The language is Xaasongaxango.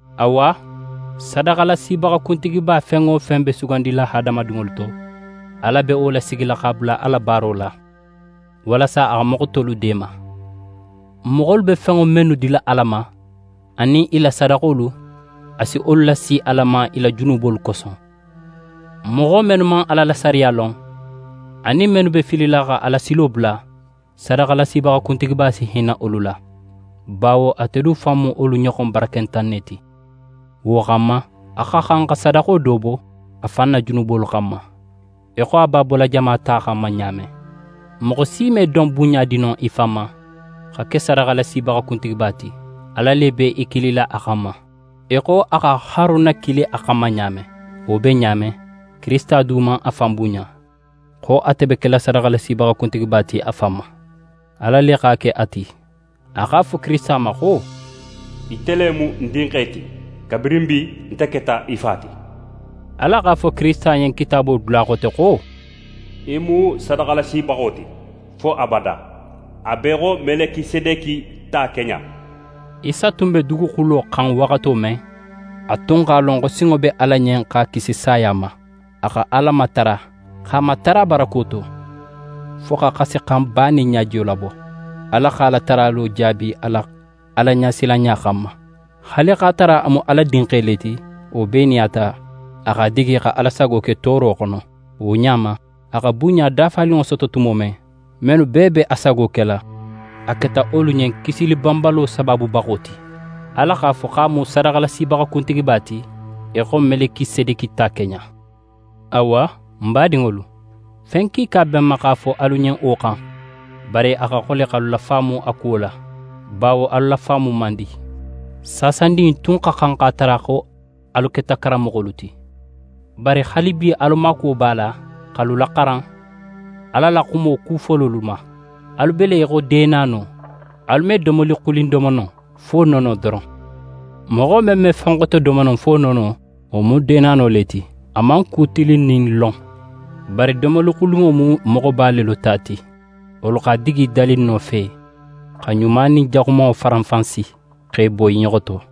Awa, sadaxalasibaxa kuntigiba fen wo fen be sugandila hadamadinŋolu to, Ala be wo lasigila x'a bula a la baaro la, walasa a xa moxo tolu deema. Moxolu be fenŋo mennu dila Ala ma, anin i la sadaxolu, a si wolu lasi Ala ma i la junubolu koso. Moxo mennu man Ala la sariya lon, anin mennu be filila xa Alasilo bula, sadaxalasibaxa kuntigiba si hinna wolu la, bawo ate du fan mu wolu ɲoxon barakentan ne ti. Wo xanma, a xa xan xa sadaxo do bo a fan na junubolu xanma, í xo a b'a bola jama ta xanma ɲa men. Moxo si me don bunɲa di no í fan ma xa ke sadaxalasibaxa kuntigiba ti. Ala le be í kilila a xanma, í xo a xa Haruna kili a xanma ɲa men. Wo be ɲa men, Kirisita du man a fan bunɲa, xo ate be kela sadaxalasibaxa kuntigiba ti a fan ma. Ala le x'a ke a ti. A x'a fo Kirisita ma xo: «Ite le mu ń Dinxe ti, kabirin bi nte keta í Fa ti.» Ala x'a fo Kirisita ɲen Kitaabo dula xote xo: «Í mu sadaxalasibaxo ti fo abada, a be í xo Melikisedeki ta keɲa.» Isa tun be duguxulo xan waxato men, a tun x'a lon xo sinŋo be Ala ɲen x'a kisi saya ma. A xa Ala matara, x'a matara barako to, fo xa xasixanba nin ɲajiyo labo. Ala x'a la taralo jaabi a la Alaɲasilanɲa xanma. Haali x'a tara a mu Ala Dinxe le ti, wo bee nin a ta, a x'a digi xa Ala sago ke tooro xono. Wo ɲa ma, a xa bunɲa dafaninŋo soto tumo men, mennu bee be a sago kela, a keta wolu ɲen kisili banbalo sabaabubaxo ti. Ala x'a fo xo a mu sadaxalasibaxa kuntigiba ti, í xo Melikisedeki ta keɲa. Awa, n badinŋolu, fen kiika be n ma x'a fo alu ɲen wo xan, bari a xa xole x'alu lafaamu a kuwo la, bawo alu lafaamu man di. Saasandin in tun xa xan x'a tara xo alu keta karanmoxolu ti, bari haalibi alu maakuwo b'a la x'alu laxaran Ala la xumo ku fololu ma. Alu be le í xo deenano, alu me domoli xulin domo no fo nono doron. Moxo men me fen xote domo no fo nono, wo mu deenano le ti, a man ku tilinnin lon. Bari domoli xulinŋo mu moxoba lelu ta ti. Wolu x'a digi dalinno fe, xa ɲuma nin jaxumanŋo faranfansi, x'e bo i ɲoxo to.